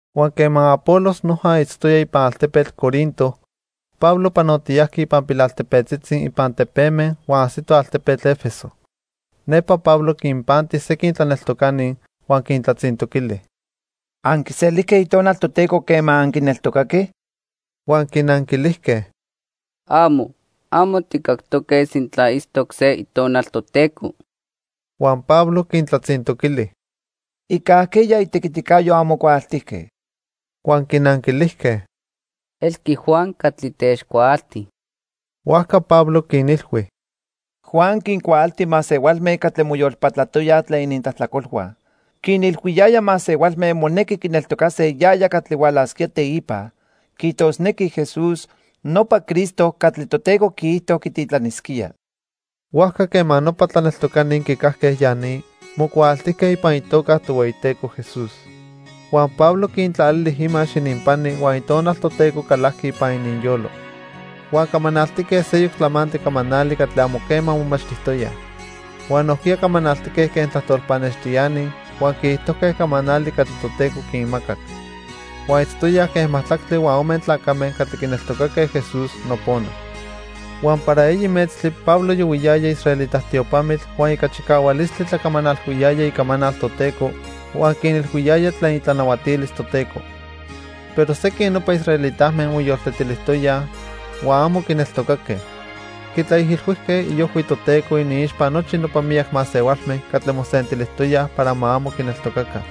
Huan quema Apolos noja itztoya ipan altepetl Corinto, Pablo panotiyajqui ipan pilaltepetzitzi ipan tepeme huan ajsito altepetl 'Efeso. Nepa Pablo quinpanti sequin tlaneltocani, huan quintlatzintoquili: —¿Anquiselijque Itonal Toteco quema anquineltocaque? Huan quinanquilijque: —¡Amo! Amo tijcactoque sintla itztoc se Itonal Toteco. Huan Pablo quintlatzintoquili: —¿Ica ajqueya itequiticayo anmocuaaltijque? Huan quinanquilijque: —Elqui Juan catli techcuaalti. Huajca Pablo quinilhui: —Juan quincuaalti masehualme catli moyolpatlatoyaj tlen inintlajtlacolhua. Quinilhuiyaya masehualme monequi quineltocase yaya catli hualasquía teipa, quiijtosnequi Jesús, nopa Cristo catli Toteco quiijto quititlanisquía. Huajca quema nopa tlaneltocani quicajque ya ni, mocuaaltijque ipan itoca Tohueyiteco Jesús. Huan Pablo quintlalili imax ininpani huan Itonal Toteco calajqui ipan ininyolo. Huan camanaltique seyoc tlamantli camanali catli amo quema momachtijtoyaj. Huan nojquiya camanaltique quen tlajtol pannextiani huan quiijtojque camanali catli Toteco quinmacac. Huan itztoyaj quen majtlactli huan ome tlacame catli quineltocaque Jesús nopona. Huan para eyi metztli Pablo yohuiyaya israelita tiopamitl huan ica chicahualistli tlacamanalhuiyaya icamanal Toteco, huan quinilhuiyaya tlen itlanahuatilis Toteco. Pero sequin nopa israelitame moyoltetilijtoya huan amo quineltocaque. Quitlaijilhuijque iojhui Toteco iniixpa nochi nopa miyac masehualme catli mosentilijtoyaj para ma amo quineltocaca.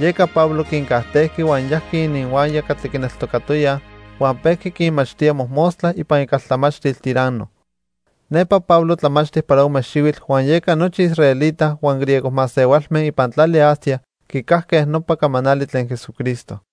Yeca Pablo quincajtejqui huan yajqui ininhuaya catli quineltocatoyaj huan pejqui quinmachtía mojmostla ipan icaltlamachtil Tiranno. Nepa Pablo tlamachti para ome xihuitl huan yeca nochi israelita huan griego masehualme ipan tlali Asia quicajque nopa camanali tlen Jesucristo.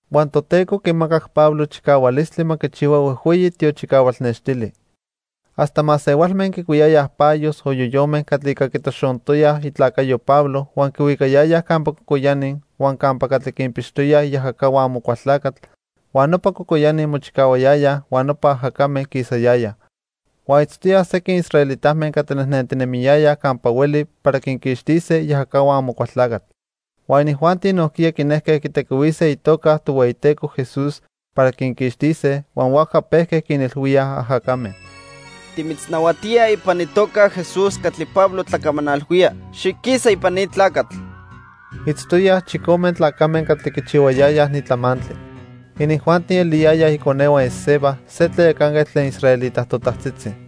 Huan Toteco quimacac Pablo chicahualistli ma quichihua huejhueyi tiochicahual nextili. Hasta masehualme quicuiyayaj payos o yoyome catli ica quitoxontoya itlacayo Pablo huan quihuicayayaj campa cocoyani huan campa catli quinpixtoyaj iajacahua Amocualtlacatl huan nopa cocoyani mochicahuayayaj huan nopa ajacame quisayayaj. Huan itztoyaj sequin israelitame catli nejnentinemiyayaj campa hueli para quinquixtise iajacahua Amocualtlacatl. Huan inijuanti nojquiya quinejque quitequihuise itoca Tohueyiteco Jesús para quinquixtise, huan huajca pejque quinilhuíaj ajacame: "Timitznahuatíaj ipan itoca Jesús catli Pablo tlacamanalhuía, xiquisa ipan ni tlacatl." Itztoyaj chicome tlacame catli quichihuayayaj ni tlamantli. Inijuanti eliyayaj iconehua Esceva, se tlayacanquetl tlen israelita totajtzitzi.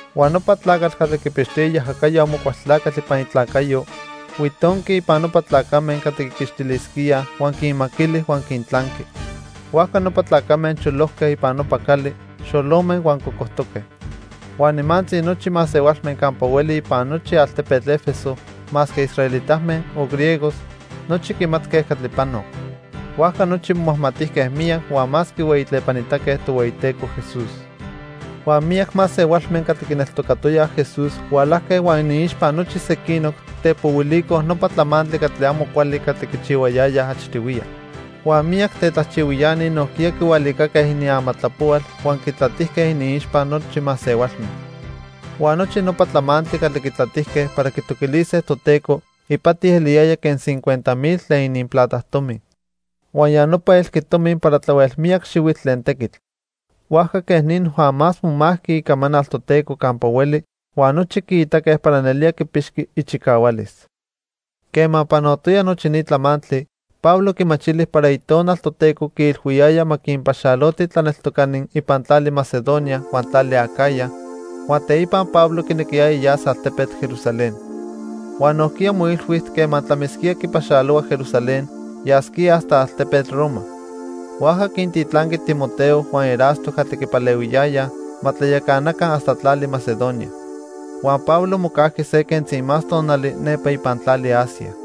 Huan nopa tlacatl catli quipixtoya iajacayo Amocualtlacatl ipan itlacayo, huitonqui ipan nopa tlacame catli quiquixtilisquíaj huan quinmaquili huan quintlanqui. Huajca nopa tlacame cholojque ipan nopa cali, xolome huan cocojtoque. Huan nimantzi nochi masehualme campa hueli ipan nochi altepetl 'Efeso, masque israelitame o griegos, nochi quimatque catli panoc. Huajca nochi momajmatijque miyac huan más quihueyitlepanitaque Tohueyiteco Jesús. Huan miyac masehualme catli quineltocatoyaj Jesús hualajque huan iniixpa nochi sequinoc, tepohuilicoj nopa tlamantli catli amo cuali catli quichihuayayaj achtihuiya. Huan miyac tetlajchihuiani nojquiya quihualicaque iniamatlapohual huan quitlatijque iniixpa nochi masehualme. Huan nochi nopa tlamantli catli quitlatijque para quitoquilise Toteco ipati eliyaya quen cincuenta mil tlen ininplata tomi huan ya nopa elqui tomi para tlahuel miyac xihuitl tlen tequitl. Huajca quej ni noja más momajqui icamanal Toteco campa hueli huan nochi quiitaque para nelía quipixqui ichicahualis. Quema panotoya nochi ni tlamantli, Pablo quimachili para Itonal Toteco quiilhuiyaya ma quinpaxaloti tlaneltocani ipan tlali Macedonia huan tlali Acaya, huan teipa Pablo quinequiyaya yas altepetl Jerusalén. Huan nojquiya moilhui quema tlamisquía quipaxalohua Jerusalén, yasquía hasta altepetl Roma. Huajca quintitlanqui Timoteo huan Erasto catli quipalehuiyayaj ma tlayacanaca hasta tlali Macedonia. Huan Pablo mocajqui se quentzi más tonali nepa ipan tlali Asia.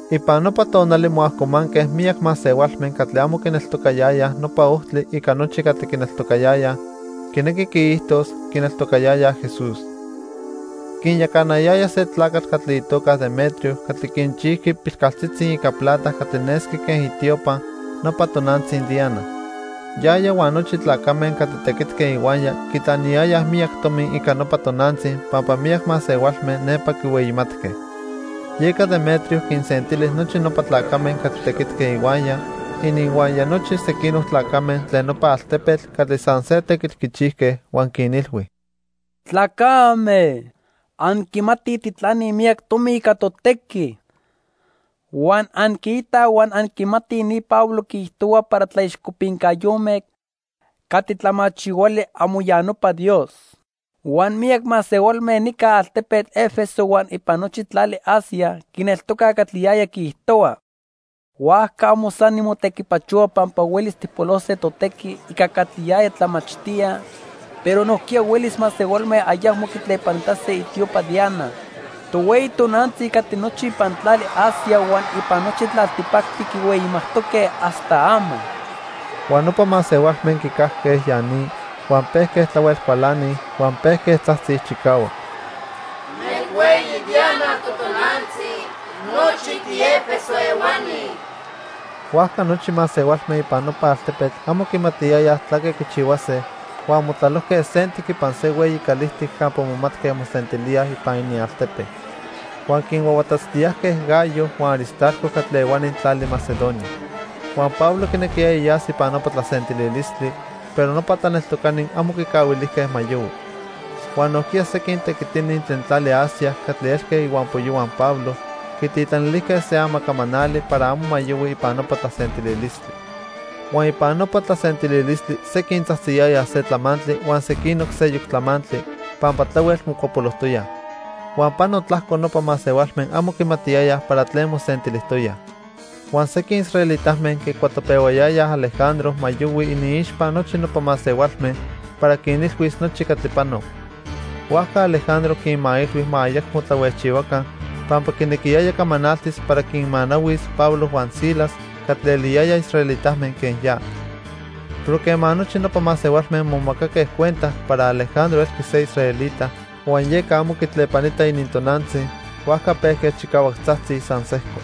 Ipan nopa tonali moajcomanque miyac masehualme catli amo quineltocayayaj Nopa Ojtli ica nochi catli quineltocayayaj, quinequi quiijtos, quineltocayayaj Jesús. Quinyacanayaya se tlacatl catli itoca Demetrio catli quinchijqui pilcaltzitzi ica plata catli nesqui quen itiopa nopa tonantzi Diana. Yaya huan nochi tlacame catli tequitque ihuaya quitlaniyayaj miyac tomi ica nopa tonantzi pampa miyac masehualme nepa quihueyimatque. Yeca Demetrio quinsentili nochi nopa tlacame catli tequitque ihuaya, ininhuaya nochi sequinoc tlacame tlen nopa altepetl catli san se tequitl quichijque huan quinilhui: "Tlacame, anquimatij tijtlanij miyac tomi ica totequi. Huan anquiitaj huan anquimatij ni Pablo quiijtohua para tlaixcopincayome catli tlamachihuali amo ya nopa dios. Huan miyac masehualme nica altepetl 'Efeso huan ipan nochi tlali Asia quineltocaj catli yaya quiijtohua. Huajca amo san nimotequipachohua pampa huelis tijpolose totequi ica catli yaya tlamachtía, pero nojquiya huelis masehualme ayacmo quitlepanitase itiopa Diana, tohueyi tonantzi catli nochi ipan tlali Asia huan ipan nochi tlaltipactli quihueyimajtoque hasta ama." Huan nopa masehualme quicajque ya ni, huan pejque tlahuel cualanij, huan pejque tzajtzij chicahuac: —¡Nelhueyi Diana totonantzi nochi ti'Efeso ehuani! Huajca nochi masehualme ipan nopa altepetl amo quimatiyayaj tlaque quichihuase huan motlalojque sentic ipan se hueyi calijtic campa momatque mosentilíaj ipan inialtepe. Huan quinhuahuatatztiyajque Gayo huan Aristarco catli ehuani tlali Macedonia. Huan Pablo quinequiyaya yas ipan nopa tlasentililistli, pero nopa tlaneltocani amo quicahuilijque ma yohui. Huan nojquiya sequin tequitini tlen tlali Asia catli elque ihuampoyohua Pablo quititlanilijque se amacamanali para amo ma yohui ipan nopa tlasentililistli. Huan ipan nopa tlasentililistli sequin tzajtziyayaj se tlamantli huan sequinoc seyoc tlamantli, pampa tlahuel mocuapolojtoyaj. Huan pano tlajco nopa masehualme amo quimatiyayaj para tlen mosentilijtoyaj. Huan sequin israelitame quicuatopehuayayaj Alejandro ma yohui iniixpa nochi nopa masehualme para quinilhuis nochi catli panoc. Huajca Alejandro quinmailhui ma ayacmo tlahuejchihuaca pampa quinequiyaya camanaltis para quinmanahuis Pablo huan Silas catli eliyayaj israelitame quen ya. Pero quema nochi nopa masehualme momacaque cuenta para Alejandro elqui se israelita huan yeca amo quitlepanita inintonantzi, huajca pejque chicahuac tzajtzij san sejco: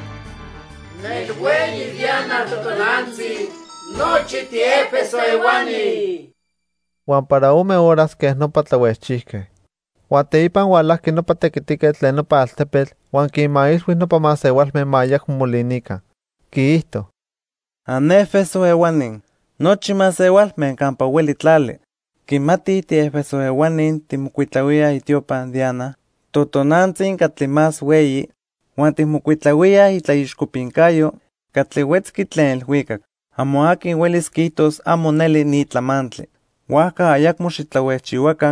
"¡Nelhueyi Diana totonantzi nochi ti'Efeso ehuani!" Huan para ome horas quej nopa tlahuejchijque. Huan teipa hualajqui nopa tequitiquetl tlen nopa altepetl huan quinmailhui nopa masehualme ma ayacmo molinica. Quiijto: "¡An'Efeso ehuani! Nochi masehualme campa hueli tlali quimatij ti'Efeso ehuani tijmocuitlahuíaj itiopa Diana, totonantzi catli más hueyi, huan tijmocuitlahuíaj itlaixcopincayo catli huetzqui tlen ilhuicac. Amo aqui huelis quiijtos amo neli ni tlamantli; huajca ayacmo xitlahuejchihuaca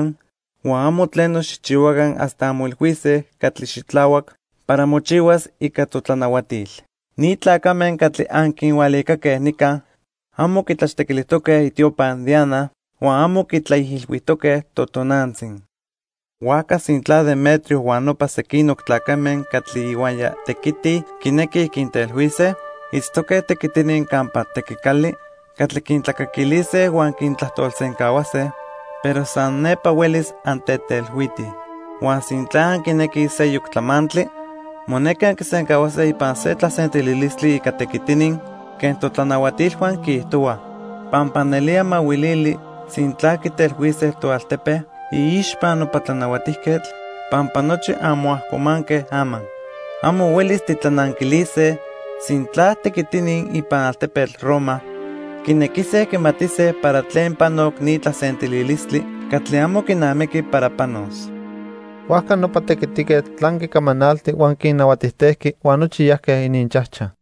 huan amo tleno xijchihuaca hasta anmoilhuise catli xitlahuac para mochihuas ica totlanahuatil. Ni tlacame catli anquinhualicaque nica amo quitlachtequilijtoque itiopa Diana huan amo quitlaijilhuijtoque totonantzi. Huajca sintla Demetrio huan nopa sequinoc tlacame catli ihuaya tequitij quinequij quintelhuise, itztoque tequitini campa tequicali catli quintlacaquilise huan quintlajtolsencahuase, pero san nepa huelis antetelhuitij. Huan sintla anquinequij seyoc tlamantli, monequi anquisencahuase ipan se tlasentililistli ica tequitini quen totlanahuatilhua quiijtohuaj. Pampa nelía mahuilili sintla quitelhuise toaltepe iixpa nopa tlanahuatijquetl pampa nochi anmoajcomanque ama. Amo huelis titlananquilise sintla tequitini ipan altepetl Roma quinequise quimatise para tlen panoc ni tlasentililistli catli amo quinamiqui para panos." Huajca nopa tequitiquetl tlanqui camanalti huan quinnahuatijtejqui huan nochi yajque ininchajchaj.